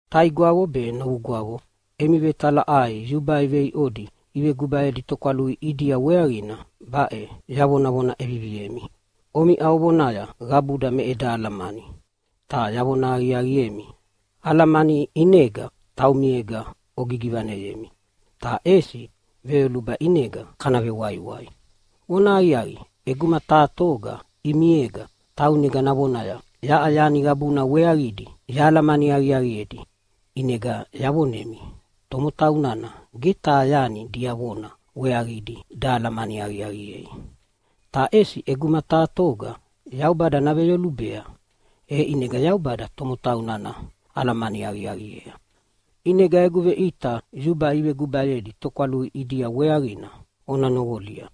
Taigwavo be novugwavo, emi vetalaʼai yubai veiʼodi ivegubayedi tokwalui ʼidia weaqina baʼe yavonavona ʼeviviemi. Omiʼa ovonaya, “Qabuda me eda alamani.” Ta yavona aqiaqiemi, alamani ʼinega taumiega ogigivaneyemi, ta ʼesi veyoluba ʼinega kana vewaiwai. Vonahaqiaqi, ʼeguma taha toga ʼimiega taunega navonaya, “Yaʼa yani qabuna weaqidi yahalamani aqiaqiedi!” ʼInega yavonemi tomotau nana ge taha yani diavona weaqidi dahalamani aqiaqiei. Ta ʼesi ʼeguma taha toga Yaubada naveyolubea, e ʼinega Yaubada tomotau nana alamani aqiaqiea. ʼInega egu veʼita yubai ivegubayedi tokwalui ʼidia weaqina ona noqolia.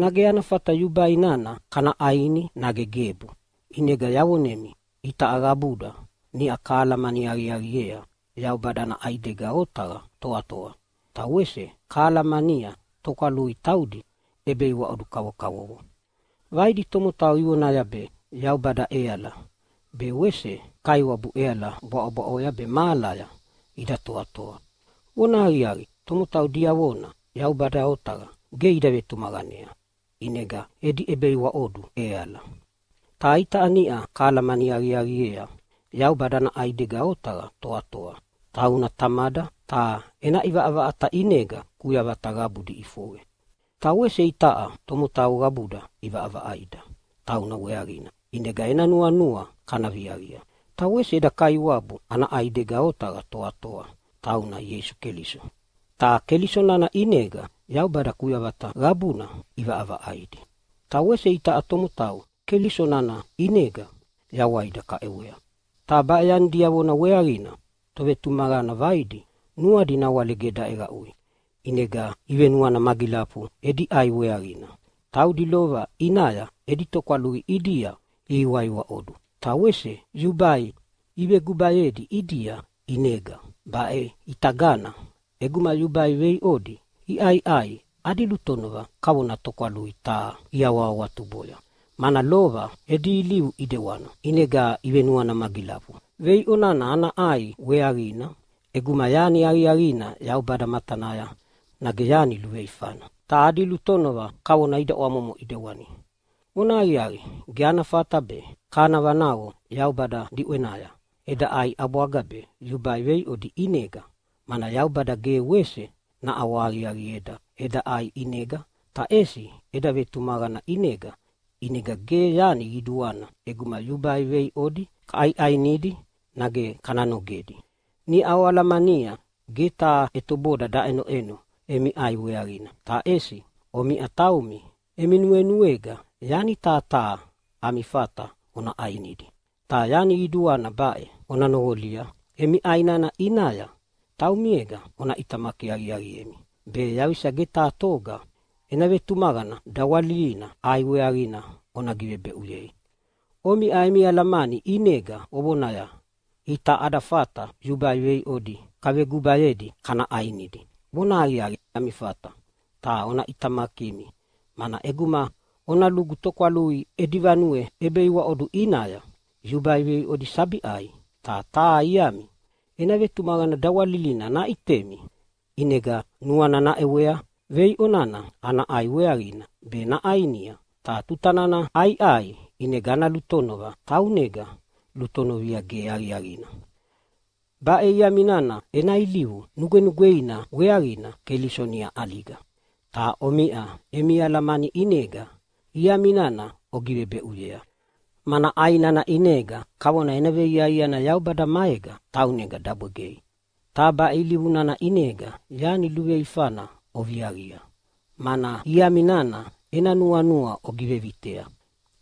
Nage ana fata yubai nana kana ʼaini nage gebu? ʼInega yavonemi itaʼa qabuda niʼa kahalamani aqiaqiea Yaubada ana ʼaidega otaqa toatoa, ta wese kahalamania tokwalui taudi ʼebeiwaʼodu kavokavovo. Vaidi tomotau ivonaya be yaubada ʼeala be wese kaiwabu ʼeala bwaʼobwaʼoya be mahalaya ida toatoa. Vonahaqiaqi, tomotau diavona Yaubada otaqa ge ida vetumaqanea ʼinega edi ʼebeiwaʼodu ʼeala. Ta itaʼa niʼa kahalamani aqiaqiea Yaubada ana ʼaidega otaqa toatoa. Tauna Tamada, ta ena ʼivaʼavaʼata ʼinega kuyavata qabudi iʼifoqe. Ta wese itaʼa tomotau qabuda ʼivaʼavaʼaida tauna weaqina ʼinega ena nuanua kana viaqia. Ta wese eda Kaiwabu ana ʼaidega otaqa toatoa, tauna Ieisu Keliso. Ta Keliso nana ʼinega Yaubada kuyavata qabuna ʼivaʼavaʼaidi, ta wese itaʼa tomotau Keliso nana ʼinega yawaida kaʼewea. Ta baʼe yani diavona weaqina tovetumaqana vaidi nuadi nawale ge daʼeqaʼui, ʼinega ivenuana magilafu edi ʼai weaqina. Taudi lova ʼinaya edi tokwalui ʼidia ihiwaiwaʼodu, ta wese yubai ivevegubayedi ʼidia. ʼInega baʼitagana ʼeguma yubai veiʼodi iʼaiʼai adi lutonova kavona tokwalui taha iawahawatuboya, mana lova edi ilivu ʼidewana. ʼInega ivenuana magilafu veiʼo nana ana ʼai weaqina ʼeguma yani aqiaqina Yaubada matanaya, nage yani luveifana. Ta adi lutonova kavona ida ʼwamomo ʼidewani. Vonahaqiaqi, ge ana fata be kana vanaqo Yaubada diʼwenaya eda ʼai ʼabwaga be yubai veiʼodi ʼidiega. Mana Yaubada ge wese naʼawahaqiaqieda eda ʼai ʼinega, ta ʼesi eda vetumaqana ʼinega. ʼInega ge yani qiduana ʼeguma yubai veiʼodi kaʼaiʼainidi nage kana nogedi. Niʼa oalamania ge taha ʼetoboda daʼenoʼeno emi ʼai weaqina. Ta ʼesi omiʼa taumi emi nuenuega yani taha taha ami fata ona ʼainidi. Ta yani qiduana baʼe ona noqolia, emi ʼai nana ʼinaya taumiega ona ʼitamaki aqiaqiemi be yaqisa ge taha toga ena vetumaqana dawalilina ʼai weaqina ona givebeʼuyei. Omiʼa emi alamani ʼinega ovonaya, “Itaʼa ada fata yubai veiʼodi kavegubayedi kana ʼainidi.” Vonahaqiaqi, ami fata, ta ona ʼitamakimi, mana ʼeguma ona lugu tokwalui edi vanue ʼebeiwaʼodu ʼinaya yubai veiʼodi sabi ʼai, ta taha iami ena vetumaqana dawalilina naʼitemi ʼinega nuana naʼewea veiʼo nana ana ʼai weaqina be naʼainia. Ta tuta nana ʼaiʼai ʼinega ana lutonova taunega lutonovia ge aqiaqina. Baʼe iami nana ena ilivu nugwenugweina weaqina Keliso niʼa ʼaliga. Ta omiʼa emi alamani ʼinega iami nana ogivebeʼuyea, mana ʼai nana ʼinega kavona ena veiaiana Yaubada maega taunega dabwegei. Ta baʼe ilivu nana ʼinega yani luveifana oviaqia, mana iami nana ena nuanua ogivevitea.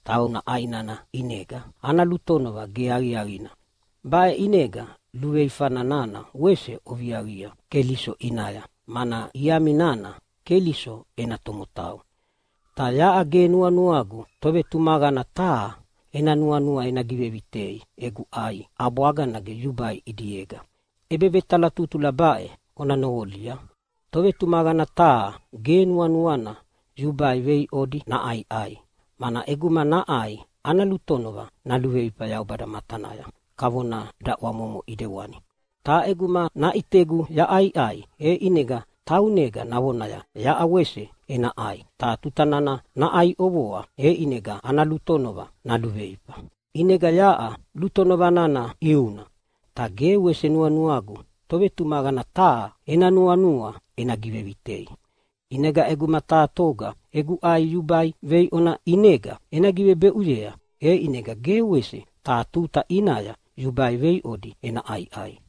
Tauna ʼai nana ʼinega ana lutonova ge aqiaqina. Baʼe ʼinega luveifa nana wese oviaqia Keliso ʼinaya, mana iami nana Keliso ena tomotau. Ta yaʼa ge nuanuagu tovetumaqana taha ena nuanua ena givevitei egu ʼai ʼabwaga nage yubai ʼidiega. ʼEbevetalatutula baʼe ona noqolia: Tovetumaqana taha ge nuanuana yubai veiʼodi naʼaiʼai, mana ʼeguma naʼai ana lutonova naluveifa Yaubada matanaya kavona daʼwamomo ʼidewani. Ta ʼeguma naʼitegu yaʼaiʼai, e ʼinega taunega navonaya, “Yaʼa wese ena ʼai.” Ta tuta nana naʼai ʼovoa, e ʼinega ana lutonova naluveifa. ʼInega yaʼa lutonova nana ʼiuna. Ta ge wese nuanuagu tovetumaqana taha ena nuanua ena givevitei. ʼInegana ʼeguma taha toga egu ʼai yubai veiʼona ʼinega ena givebeʼuya, e ʼinega ge wese taha tuta ʼinaya yubai veiʼodi ena ʼaiʼai.